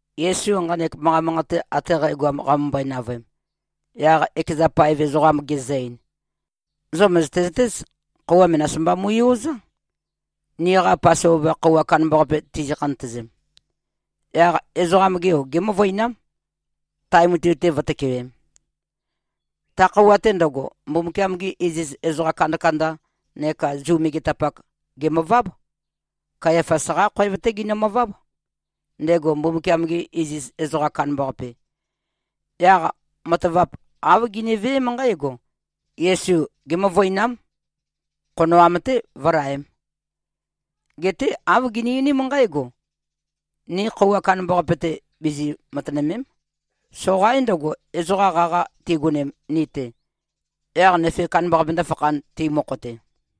Yesu nqanek manqa manqate ate qægoam qamømbøe-navøem, yaq ekeza paev ezoqam gezø-ein, “Zo mø̀zøte-zøtéz, khøuwa menas mba mui-ozá, niqa Pasova khøuwa kandambaqape tizi-khantøzem. Yaq Ezoqam-ge Yo gémøvøinám, tae mutui-te vǿtøkewēm.” Ta khøuwa-te ndøgo, Mbumbukiam-gi iziz ezoqa kandakanda neka Zu megetapak, gèmøváb. Kayafas-qá khoev-té ginømøváb, ndego Mbumbukiam-ge iziz ezoqam kandambaqape. Yaq matavap āv giniveém nqǽgo: Yesu gémøvøinám, khonoam-té, vǿlaēm. Geté āv gini-einím nqǽgo, “Ni khøuwa kandambaqape-te, bizi-matønø̀me᷄m. Soqaín ndøgo, ezoqa qaqa tigonem ni-te, yaq nøfe kandambaqape ndǿfakhān, ti mokho-te.”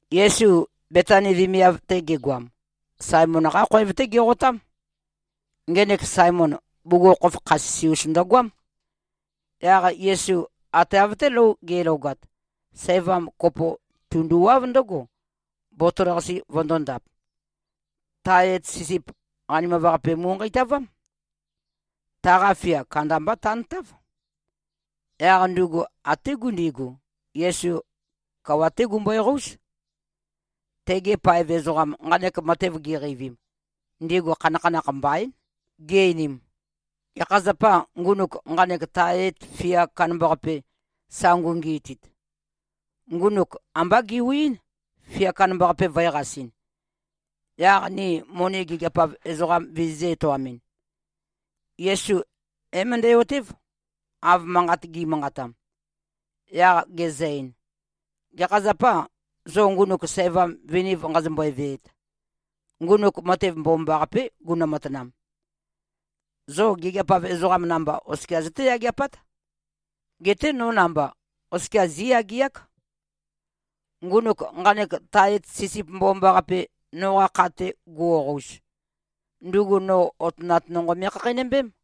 Yesu Betani vemiav-te gegoam, Saemon-qá khoev-té geqotám. Ngenek Saemon, bugukhokhof kha sisi-us ndøgoám. Yaq Yesu ate av-té lou ge꞉logat, sævam kopo tunduwáv ndǿgo, botol-qase vøndōndap. Tae et sisip qanimav-qape mu꞉nqeitavám. Taqa fia kandamba tantáv. Yaq ndugu até gundigu, Yesu, kawa-té gumbøe-qóuz. Tegi paev ezoqam, nqanek matev giqeivim, ndigu khanakhanakh mbaín, gi-einim, “Gekha zapâ, ngunuk nqanek tae et fia kandambaqape, sa ngungiitit? Ngunuk ambá gewiín, fia kandambaqape vø̄qasɨn, yaq ni moni gigiap-av ezoqam vizizø̄-etoamɨn.” Yesu é-møndæ-otév, av manqat gi꞉manqatam, yaq gezø-ein, “Gekha zapâ, zo ngunuk sævam viniv nqazombøe-veet? Ngunuk matev mbomambaqapé gunø-matanam. Zo gigiap-av ezoqam namba oskia zøté-yageapát. Geté no namba, oskia zí꞉yageák. Ngunuk nqanek tae et sisip mbomambaqape, noqa kha-te guoqouz, ndugu no otønat nonqo me꞉khakheinømbém.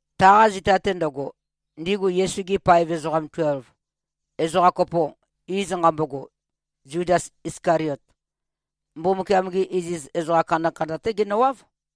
Taqa zita-te ndøgo, ndigu Yesu-gi paev ezoqa tuelv, ezoqa kopo, iz nqambogo, Zudas Iskaliot, Mbumbukiam-gi iziz ezoqa kandakanda-té genøwáv,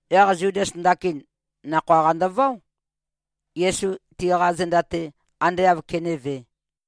Yaq Zudas ndakin nakhoa-qa ndøváo, Yesu tiqa zenda-te ande āv kenévē.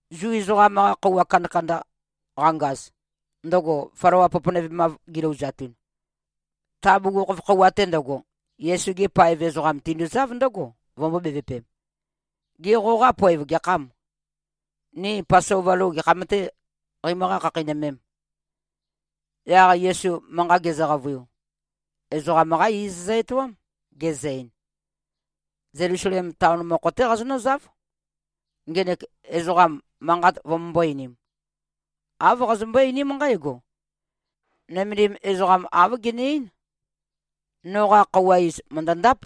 Zu ezoqam-qa khøuwa kandakanda qangaz, ndøgo flawa poponøvemav gilouzatun, ta bugukhokhof khøuwa-te ndøgo, Yesu-gi paev ezoqam tinduzáv ndǿgo, vømbō-bevøpem, “Gê, qoqa poev gekhâm? Ni Pasova lou gekham-tē qeimøqá-khakheinømēm?” Yaq Yesu manqa gezø-qavøiu, ezoqam-qá iz zø-etoám, gezø-ein, “Zelusalem taon mokho-té qazonǿzáv, ngenek ezoqam manqat vømømbó-einīm. Āv qazømbøé-einím nqǽgo, ‘Nømendim ezoqam, āv gene-eín: Noqa khøuwa iz mø̀ndøndáp.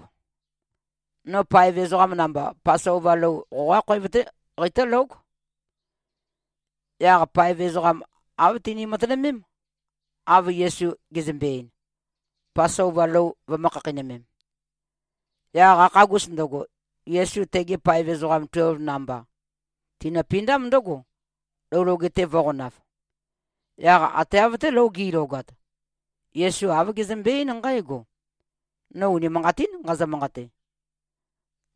No paev ezoqam namba, Pasova lou, qoqá khoev-té qeitǿlóg.’” Yaq paev ezoqam āv tini-matønømém, av Yesu gezømbe-ein, Pasova lou vømø̄-khakheinømem. Yaq qakhagus ndøgo, Yesu tegi paev ezoqam tuelv namba tinøpindám ndǿgo, lou loge-te vø̄qonav. Yaq ate av-té lou gi꞉logat, Yesu āv gezømbe-eín nqǽgo, “No unimanqatín nqazø-manqate: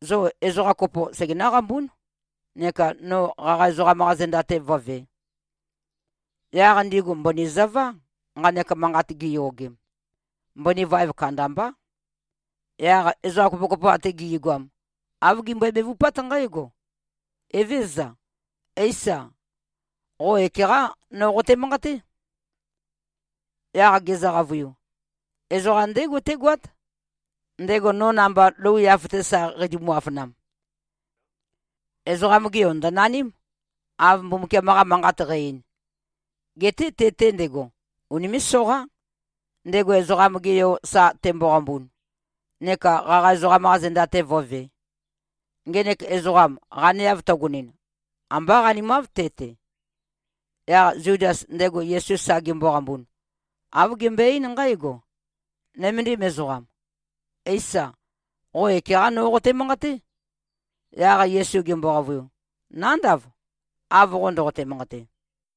Zo ezoqa kopo segenǿ-qambún, neka no qaqa ezoqam-qa zenda-te vǿvē.” Yaq ndigu mbøni zøvá, nqanek manqat giyogem. Mbøni vaev kandambá. Yaq ezoqa kopokopo ate gi꞉goam āv gimbøe-bevupát nqǽgo, “Evézøza. Éisa. Qo ekeqá no qote-manqaté.” Yaq gezø-qavøiu, “Ezoqam ndégo tégoát, ndego no namba lou yaf-te sa qeitumu-afønam. Ezoqam-ge Yo ndø̀naním, av Mbumbukiam-qa Manqat qæ-ein. Geté te-te ndego, unimé꞉-soqá, ndego Ezoqam-ge Yo sa temboqambun, neka qaqa ezoqam-qa zenda-te vǿvē. Ngenek ezoqam qaneav tøgonin, ambá qanimáv te-te.” Yaq Zudas, ndego Yesu sa gemboqambun, āv gembøe-eín nqǽgo, “Nøméndim ezoqam. Éisa. Qo ekeqá no qote-manqaté?” Yaq Yesu gembo-qavøiu, “Nándav, av qo ndoqote-manqate.”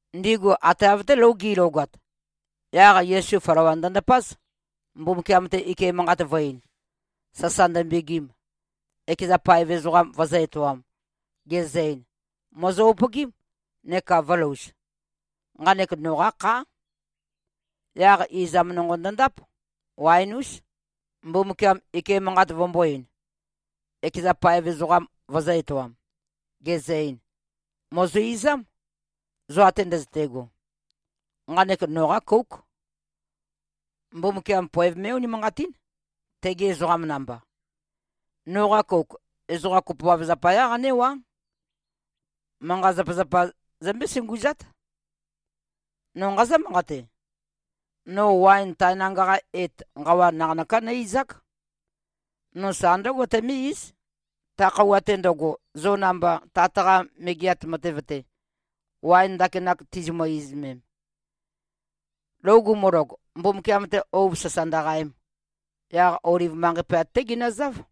Ndigu ate av-té lou gi꞉logat, yaq Yesu flawa ndøndapáz, Mbumbukiam-te ike manqat vø̄-ein, sasa ndømbegim, ekeza paev ezoqam vøzø̄-etoam, gezø-ein, “Mòzo-upøgím, neka vø̄louz. Nqanek noqá khá.” Yaq izam nonqo ndøndáp, waen-ús, Mbumbukiam ike manqat vømbō-ein, ekeza paev ezoqam vøzø̄-etoam, gezø-ein, “Mòzo-izám, zo ate ndøzøte꞉go. Nqanek noqá kóuk. Mbumbukiam poev mé꞉-unimanqatín, tegi ezoqam namba. Noqa kouk, ezoqam kopoav zapayá qanéwá. Manqa-zapazapa zømbé-sunguzát. No nqazǿ-manqate: No waen tae nanga-qa et, nqawa naqanøká nǿ-izák. No sa ndǿgo tømé-íz, ta khøuwa-te ndøgo, zo namba Tat-qa Megeat Matev-te, waen ndakinak tizimø-izømem.” Lou gumulog, Mbumbukiam-te ouv sasa ndøqaem, yaq Oliv manqei pøyat-té ginøzáv.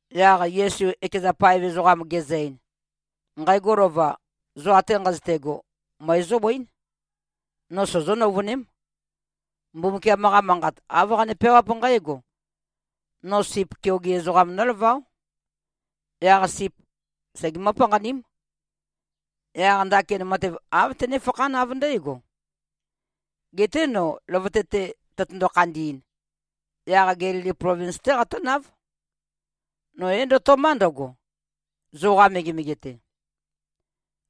Yaq Yesu ekeza paev ezoqam gezø-ein, “Nqægo lova, zo ate nqazøte꞉go, møe zóbøín. No sozó-nøuvøném. Mbumbukiam-qa Manqat, āv qane-peawáp nqǽgo, ‘No sip keoge ezoqam nólaváo. Yaq sip segemǿ-panqaním.’ Yaq ndakin matev āv tønéfakhán, av ndǽgo. Geté no løvøte-te tøtøndo-khandi꞉n, yaq Gelili plovins-té qatǿnáv. No é-ndøto꞉má ndøgo, zoqa megemege-te.”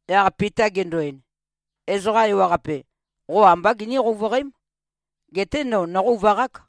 Yaq Pita gendo-ein, “Ezoqa ewaqape, qo ambá giní-qouvøqém. Geté no, nóqouvaqák.”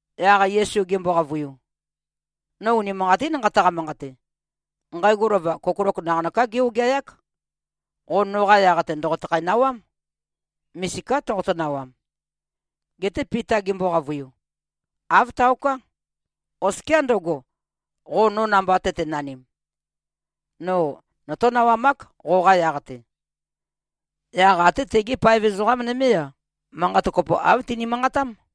Yaq Yesu gembo-qavøiu, “No unimanqatín nqataqa-manqate: Nqægo lova kokolok naqanøká gé-ogeayák. Qo noqa yaq-te ndòqotøkhæ-nawám. Misiká toqoto-nawam.” Geté Pita gembo-qavøiu, “Āv taoká. Oskiá ndøgo, qo namba tøtenanim. No notó-nawamák, qoqa yaq-te.” Yaq até tegi paev ezoqa nømé-a, manqat kopó, āv tini-manqatám.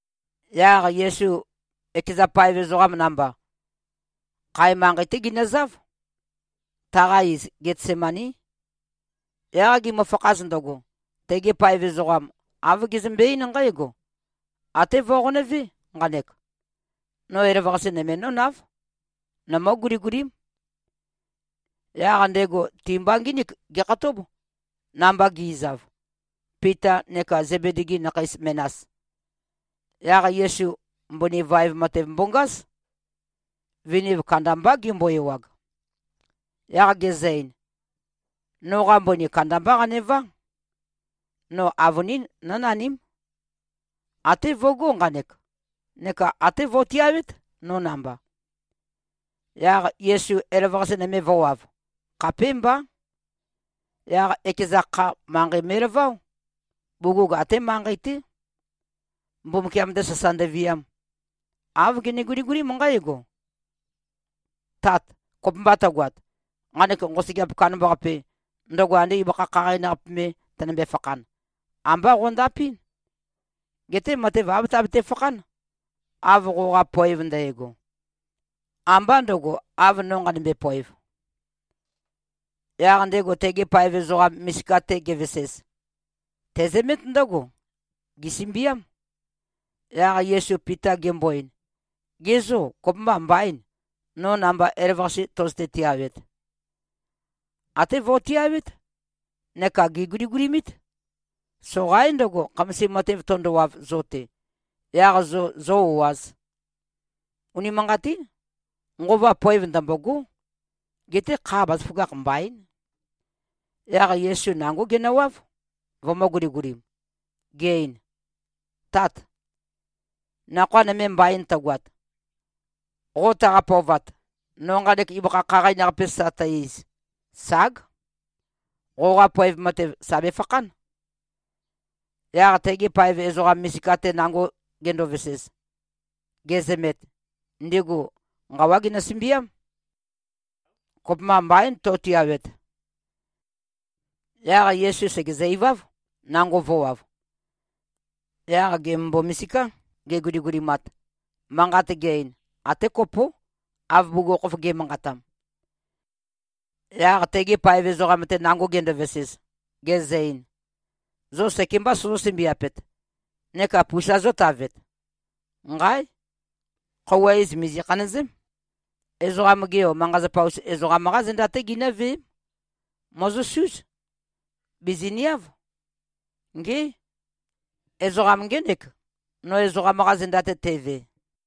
Yaq Yesu ekeza paev ezoqam namba, khae manqei-té ginøzáv. Taqa iz, Getsemaní. Yaq gimøfakhaz ndøgo, tegi paev ezoqam, āv gezømbe-eín nqǽgo, “Até vo꞉qonøvé nqanek. No elavøqase nøme nǿnáv. Nomǿ-guligulím.” Yaq ndego ti-mba ngínik gekhatób, namba gi꞉zav, Pita neka Zebedi-gi nakhei menas. Yaq Yesu mbøni vaev matev mbongáz. Viniv kandambá gembo-ewag. Yaq gezø-ein, “Noqa mbøni kandambá qanevá. No avønín, nǿnaním. Até vøgó nqanek, neka até vo꞉tiawét, no namba.” Yaq Yesu elavøqase nøme vø̄wav. Khapémbá. Yaq ekeza kha, manqei me꞉laváo, bugug até manqei-té, Mbumbukiam-te sasa ndøviam. Āv gene-guligulím nqǽgo, “Tát! Kopømba tøgoat, nqanek nqosøgeap kandambaqape, ndøgo ande ibøkha khaqain-qape me tønømbe-fakhan, ambá qøndapɨ́n. Geté matev āv tabete-fakhán, av qoqa poev ndægo. Ambá ndø̄go, av no nqanømbe-poev.” Yaq ndego tegi paev ezoqa misika-te gevesez, tezømét ndǿgo. Gèsømbiám. Yaq Yesu Pita gembo-ein, “Ge zô, kopømba mbaîn, no namba elavøqase tøzøte-tiawet? Até vo꞉tiawét, neka gèguligulimít. Soqaín ndøgo, khamasim matev tøndowav zo-te, yaq zo zō-o꞉āz. Unimanqatín. Nqova poev ndømbôgó. Geté kha, bazaføgakh mbaín.” Yaq Yesu nangó genøwáv, vømø̄-guligulim, ge-ein, “Tát! Nakhoa nøme mbain tøgoat. Qo taqa-pøovat, no nqanek ibøkha khaqain-qape sa tæ-iz, ság. Qoqa poev matev sà befakhán.” Yaq tegi paev ezoqa misika-te nango gendovesez, gezømet, ndigu nqawá ginø-sømbiám. Kopømba mbaín, to꞉tiawet. Yaq Yesu sègezø-iváv, nango vø̄wav. Yaq gèmømbo-misiká, geguligulimat. Manqat ge-ein, até kopó, av bugukhokhof ge꞉manqatam. Yaq tegi paev ezoqam-te nango gendovesez, gezø-ein, “Zo sekembā sozó-sømbiapet neka pusa zótavet? Nqáe! Khøuwa iz mìzi-khanøzém. Ezoqam-ge Yo, manqa-zapazapa-us ezoqam-qá zenda-té ginǿveém. Mòzosúz. Bìziniáv. Ngé! Ezoqam ngének, no ezoqam-qa zenda-te teve!”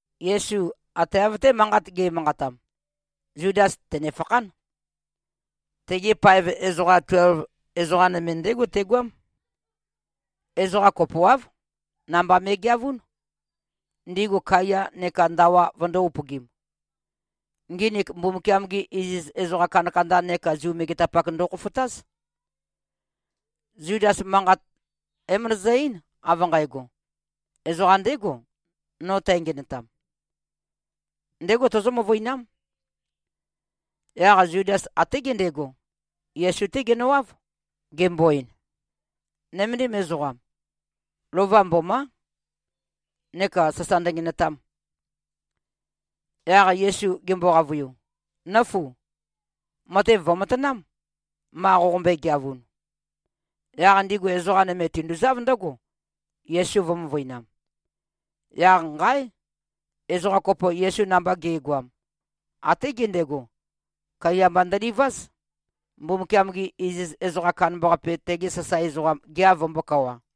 Yesu ate av-té manqat ge꞉manqatam, Zudas tènefakhán. Tegi paev ezoqa tuelv, ezoqa nøme ndégo tegoám. Ezoqa kopoáv, namba me꞉geavún, ndigu kaiya neka ndawa vøndō-upøgim. Nginik Mbumbukiam-gi iziz ezoqa kandakanda neka Zu megetapak ndokhofotáz. Zudas, manqa é-møndøzø-eín, av nqægo, “Ezoqam ndégo, no tængenøtam. Ndégo tozó-møvøinám.” Yaq Zudas até gendego, Yesu-té genøwáv, gembo-ein, “Nøméndim ezoqam. Lova mbomá.” Neka sasa ndøngenøtam. Yaq Yesu gembo-qavøiu, “Nǿfu. Matev vø̀matanám, ma qoqombøe-geavun.” Yaq ndigu ezoqa nøme tinduzáv ndǿgo, Yesu vø̄-møvøinam. Yaq nqáe! Ezoqa kopo, Yesu namba ge꞉goam, até gendego, kaiya mba ndøliváz, Mbumbukiam-ge iziz ezoqam kandambaqape, tege sasae ezoqam, gea vømbōkawa.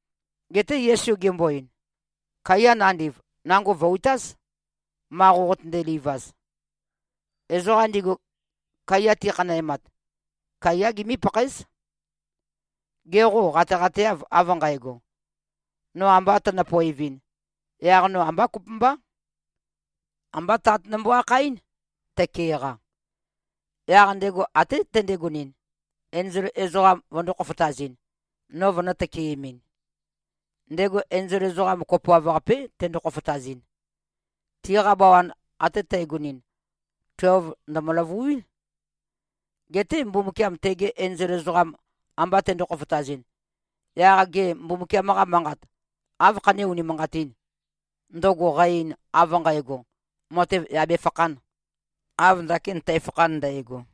Geté Yesu gembo-ein, “Kaiya nandiv, nango vø̀-utáz, ma qoqotønde-livaz. Ezoqam ndigu kaiya ti꞉khanæmat, kaiyá gimí-pakhaéz. Ge qô, qateqateâv, av nqægo? No amba tønø-poevɨn, yaq no ambá kopømbá. Ambá Tat nombo-akhaɨ́n, tøke-qa. Yaq ndego até tendegonɨn, enzol ezoqam vøndō-khofotazɨn, no vønø̄-tøkeemɨn. Ndego enzol ezoqam kopoav-qapé tendo-khofotazɨn. Tiqa bawan ate tægonɨn, tuelv ndø̀mø-løvuín. Geté Mbumbukiam tegi enzol ezoqam amba tendo-khofotazɨn, yaq gê, Mbumbukiam-qa Manqat áv khané-unimanqatīn, ndøgo qa-ein, av nqægo, matev yà befakhān, av ndakin tæfakhan ndægo?”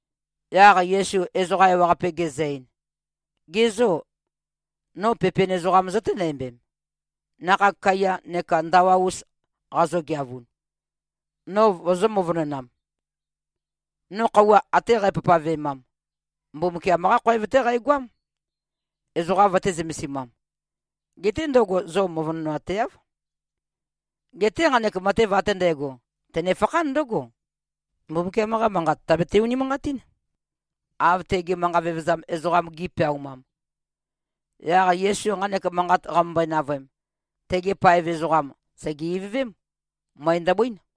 Yaq Yesu ezoqa ewaqape gezø-ein, “Ge zô, no pepen ezoqam zøténæmbem, nakhag kaiya neka ndawa-us qazogeavun, no vozó-møvønonām? No khøuwa ate qæpavpavemam, Mbumbukiam-qá khoev-té qæqoám, ezoqa vøtē-zømesimam. Geté ndøgo, zo no møvønoateáv. Geté nqanek matev ate ndægo, tønefakhán ndǿgo, Mbumbukiam-qa Manqat tàbete-unimanqatín, av tegi manqa vevezam ezoqam gi꞉peaumam.” Yaq Yesu nqanek manqat qamømbøe-navøem, tegi paev ezoqam sège-ivøvém. Møe ndøbøín.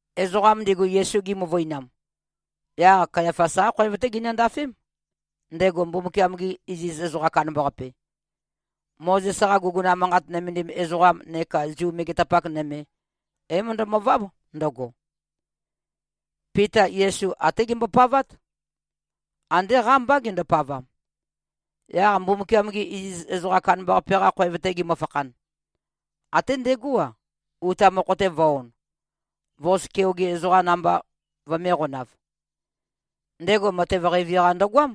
Ezoqam ndigu, Yesu gimøvøinam, yaq Kayafas-qá khoev-té ginøndafém, ndego Mbumbukiam-ge iziz ezoqam kandambaqape. Mozes-qa guguna manqat nømendim ezoqam neka Zu megetapak nøme, é-møndømøváb ndøgo. Pita Yesu até gembopavát. Andé qámbá gendopavam. Yaq Mbumbukiam-ge iziz ezoqam kandambaqape-qa khoev-te gemøfakhan, até ndegó-a, uta mokho-te vø̄-on, vos keoge ezoqam namba vømēqonav. Ndego matev qeivi-qa ndøgoám,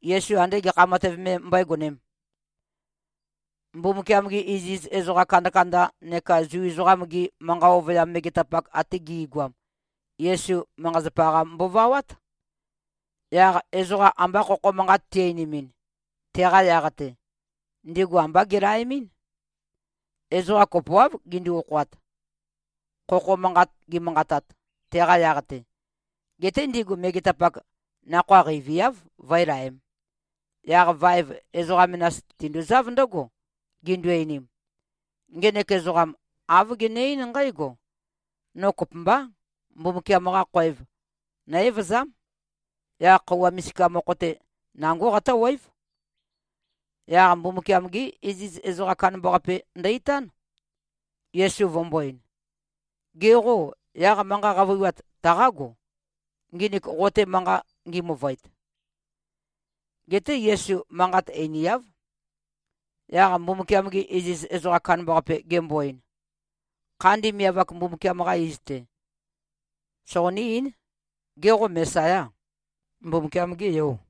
Yesu andé gekha matev me mbøégonēm. Mbumbukiam-gi iziz ezoqa kandakanda neka Zu ezoqam-gi manqa ovøyam megetapak ate gi꞉goam, Yesu, manqa-zapazapa-qa mbovawát. Yaq ezoqa amba khokho manqat ti-einimin, teqa yaq-te, ndigu ambá gelaemɨ́n. Ezoqa kopoáv gindu-okhoat, khokho manqat gimanqatat, teqa yaq-te. Geté ndigu megetapak nakhoa qeiviáv, vǿelaēm. Yaq vaev, ezoqa menas tinduzáv ndǿgo, gindu-einim, “Ngenek ezoqam āv gene-eín nqǽgo, ‘No kopømbá. Mbumbukiam-qa khoev nó-evøzám. Yaq khøuwa misika mokho-te, nangó qatǿwév.’” Yaq Mbumbukiam-gé iziz ezoqam kandambaqape ndø-itán, Yesu vømbō-ein, “Ge qô, yaq manqa qavøiwat taqágo, nginik qo-te manqat ngi-møvøet?” Geté Yesu manqat einiáv. Yaq Mbumbukiam-ge iziz ezoqam kandambaqape gembo-ein, “Khandi Miav-ak Mbumbukiam-qa iz-te, soqoní-eín. Gê, qo Mesayâ? Mbumbukiam-gê Yò?”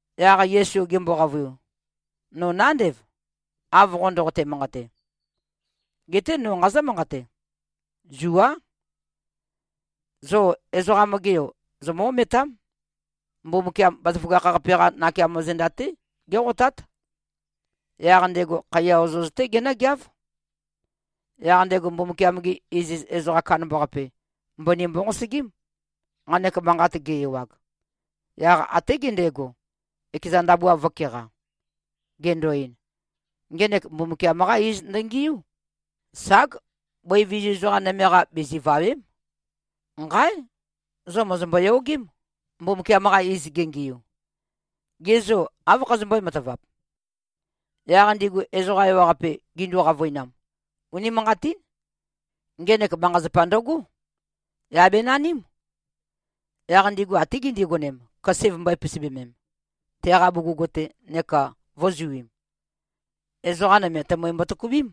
Yaq Yesu gembo-qavøiu, “No nándev, av qo ndoqote-manqate. Geté no nqazǿ-manqate. Zuá. Zo Ezoqam-ge Yo zomǿ-ometám. Mbumbukiam Bazaføgakh-qape-qá nakeamo zenda-té géqotát. Yaq ndego khaiya ozoz-té genǿgeáv.” Yaq ndego Mbumbukiam-ge iziz ezoqam kandambaqape, mbøni mbonqosøgím, nqanek manqat ge-ewag. Yaq até gendego, ekeza ndabua vø̄keqa, gendo-ein, “Ngenek Mbumbukiam-qá iz ndøngiú. Ság! Bøi vizu ezoqa nøme-qa bizivàwe᷄m. Nqáe! Zo mòzombo-yogém, Mbumbukiam-qa iz gengiu. Ge zô, áv khazømbøé-matavap?” Yaq ndigu ezoqa ewaqape gindu-qavøinam, “Unimanqatín. Ngenek manqa-zapa ndøgó. Yà benaním.” Yaq ndigu até gindigonem, køse vømbø̄e-pisibømem, teqa bugug-te, neka vø̄zuim. Ezoqa nøme, tømøi mbotøkubím,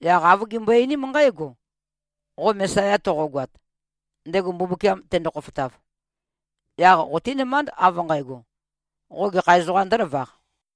yaq āv gimbøe-einím nqǽgo, “Qo Mesaya toqogoat, ndego Mbumbukiam tendo-khofotav, yaq qotínømánd, av nqægo, qo gekha ezoqām ndǿlavaq?”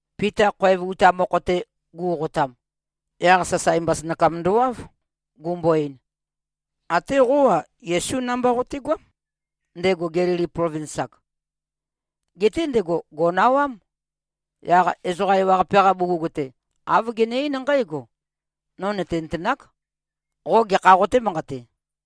Pita khoev uta mokho-te gu꞉qotam, yaq sasae mbasønakam ndowáv, gumbo-ein, “Até qó-a, Yesú namba qotegoám, ndego Gelili plovins-ak.” Geté ndego gò꞉nawám. Yaq ezoqa ewaqape-qa bugug-te, āv gene-eín nqǽgo, “No nø̀tenøtenák, qo gekhā qotē-manqate.”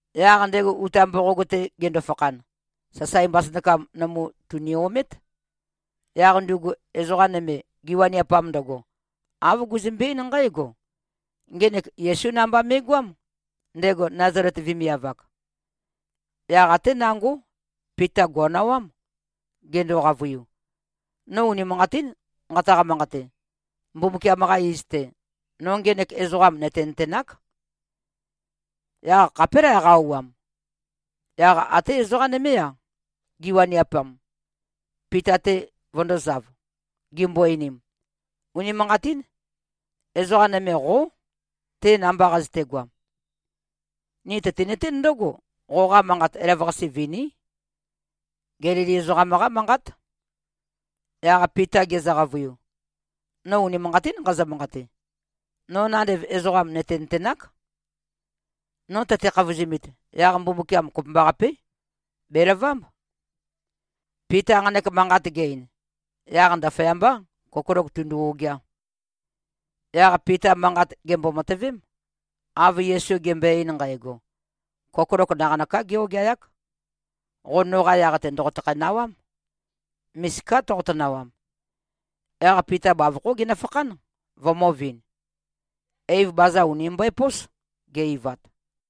Yaq ndego uta mboqog-te gendo-fakhan, sasae mbasønakam nømu tùni-omét. Yaq ndugu ezoqa nøme, giwaniapam ndøgo, āv guzømbe-eín nqǽgo, “Ngenek Yesú namba me꞉goám, ndego Nazalet vemiav-ak.” Yaq até nangó, Pita gò꞉nawám, gendo-qavøiu, “No unimanqatín nqataqa-manqate. Mbumbukiam-qa iz-te, no ngenek ezoqam nø̀tenøtenák.” Yaq khapélæ qa-auwam. Yaq até ezoqa nømé-a, giwaniapam, Pita-te vø̄ndozáv, gimbo-einim, “Unimanqatín. Ezoqa nøme qó, te namba qazøtegoam. Ni tøtinøtén ndǿgo, qoqa manqat elavøqase viní. Gelili ezoqam-qá manqát.” Yaq Pita gezø-qavøiu, “No unimanqatín nqazø-manqate. No nandev ezoqam nø̀tenøtenák. No tøte-khavozumit, yaq Mbumbukiam kopømbaqapé, bèlavámb.” Pita nqanek manqat ge-ein, yaq ndaføyambá, kokolok tūndū-ōgeā. Yaq Pita manqat gèmbo-matøvém, av Yesu gembøe-ein nqægo, “Kokolok naqanøká gé-ogeayák. Qo noqa yaq-te ndòqotøkhæ-nawám. Misiká toqoto-nawam.” Yaq Pita bavokhó genøfakhán, vømø̄vin. Eiv baza ùni mbøepós, ge-eivat.